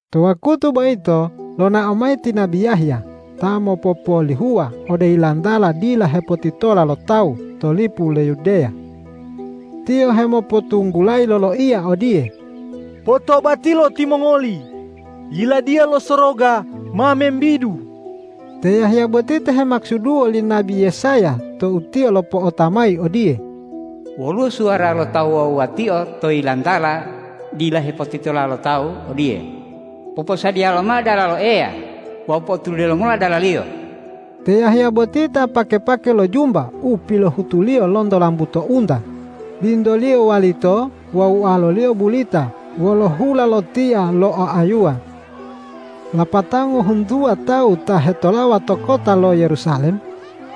To wakutu boyito lonao mayi ti nabi Yahya ta mopopolihuwa ode yilantala dila hepotitola lo tawu to lipu lo Yudeya. Tiyo hemopotunggulayi loloiya odiye, ”Potobatilo timongoli! Yiladiya lo Soroga ma membidu!” Te Yahya boti ta hemakusuduwo li nabi Yesaya tou tiyo lopo'ota mayi odiye,”Woluwo suwara lo ta wuwa-wuwatio to yilantala dila hepotitola lo tawu odiye, ’Poposadiya lomao dalalo Eya wawu po'otulide lomola dala-Liyo.’” Te Yahya boti ta pake-pake lo jumba u pilohutuliyo lonto lambuto unta, bintoliyo walito wawu ualoliyo bulita wolo hula lo tia lo oayuwa. Lapatao ngohuntuwa tawu ta hetolawa to kota lo Yerusalem,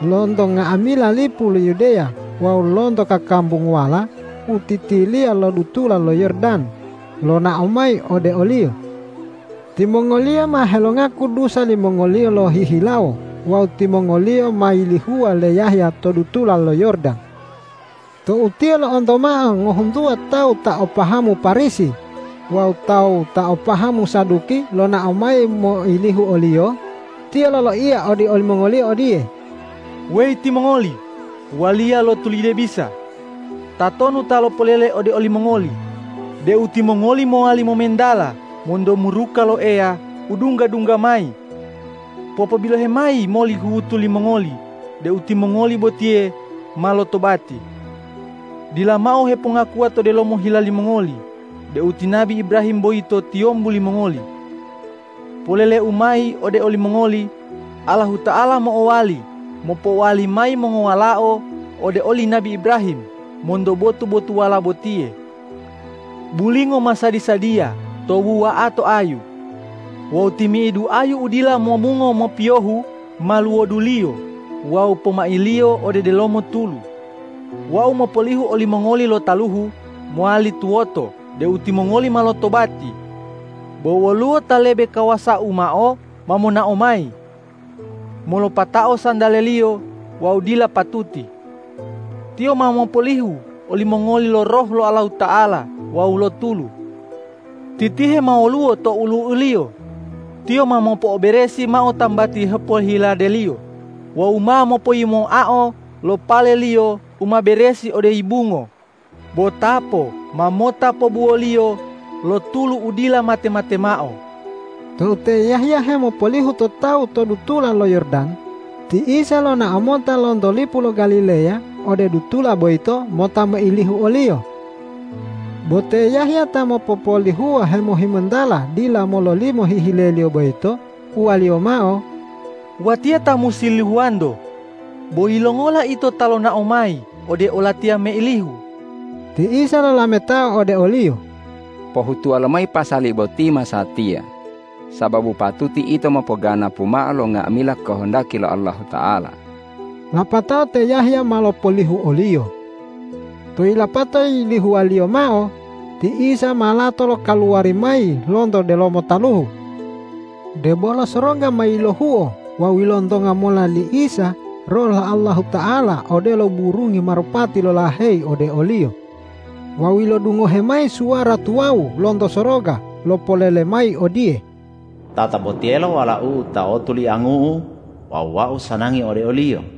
lonto nga'amila lipu lo Yudeya wawu lonto kakambunguwala u titiliya lo dutula lo Yordan, lonao mayi ode oliyo. Timongoliyo ma helongaku dusa limongoliyo lohihilawo wawu timongoliyo ma yilihuwa le Yahya to dutula lo Yordan. Tou tiyo lo'onto mao ngohuntuwa tawu ta o pahamu Parisi wawu tawu ta o pahamu Saduki lonao mayi moilihu oliyo, tiyo loloiya ode olimongoliyo odiye,”Weyi timongoli waliya lo tulide bisa! Tatonu ta lopolele ode olimongoli deu timongoli mowali momentala monto muruka lo Eya u dungga-dungga mayi? Popobilohe mayi moli huhutu limongoli deu timongoli botiye ma lotobati. Dila mao hepongakuwa to delomo hila limongoli deu ti nabi Ibrahim boyito tiyombu limongoli. Polele-u mayi ode olimongoli: Allahuta'ala mo'owali mopowali mayi mongowalao ode oli nabi Ibrahim monto botu-botuwala botiye. Bulingo ma sadi-sadiya to wuwa'ato ayu. Wawu timi'idu ayu u dila momungo mopiyohu ma luwoduliyo wawu pomailiyo ode delomo tulu. Wau mopolihu olimongoli lo taluhu mowali tuwoto deu timongoli ma lotobati, bo woluwo Ta lebe kawasau mao ma monao mayi. Molopatao santale-Liyo wau dila patuti. Tiyo ma mopolihu olimongoli lo Roh lo Allahuta'ala wawu lo tulu. Titihe ma woluwo to olu'u-Liyo. Tiyo ma mopo'oberesi mao tambati hepohilade-Liyo wawu ma mopoyimoao lo pale-Liyo u ma beresi ode yibungo, bo tapo ma mota pobuwo-Liyo lo tulu u dila mate-mate mao.” Tou te Yahya hemopolihu to tawu to dutula lo Yordan, ti Isa lonao mota lonto lipu lo Galileya ode dutula boyito mota moilihu oliyo. Bo te Yahya ta mopopolihuwa hemohimontala dila mololimo hihile-Liyo boyito, uwaliyo mao,”Watiya ta musi lihuwa-Nto, bo yilongola Ito ta lonao mayi ode olatiya meilihu?” Ti Isa lolametao ode oliyo,”Pohutuwa lomayi pasali boti masatiya, sababu patuti ito mopoganapu mao lo nga'amila kohondaki lo Allahuta'ala.” Lapatao te Yahya ma lopolihu o-Liyo. Tou yilapato yilihuwaliyo mao, ti Isa ma lato lokaluwari mayi lonto delomo taluhu. Debolo soroga ma yilohuo wawu ilontonga mola li Isa Roh lo Allahuta'ala odelo burungi marupati lolaheyi ode o-Liyo. Wawu ilodungohe mayi suwara tuwawu lonto soroga lopolele mayi odiye,”Tatabotiyelo Walau-U ta otoliangu-U wawu Wau sanangi ode o-Liyo.”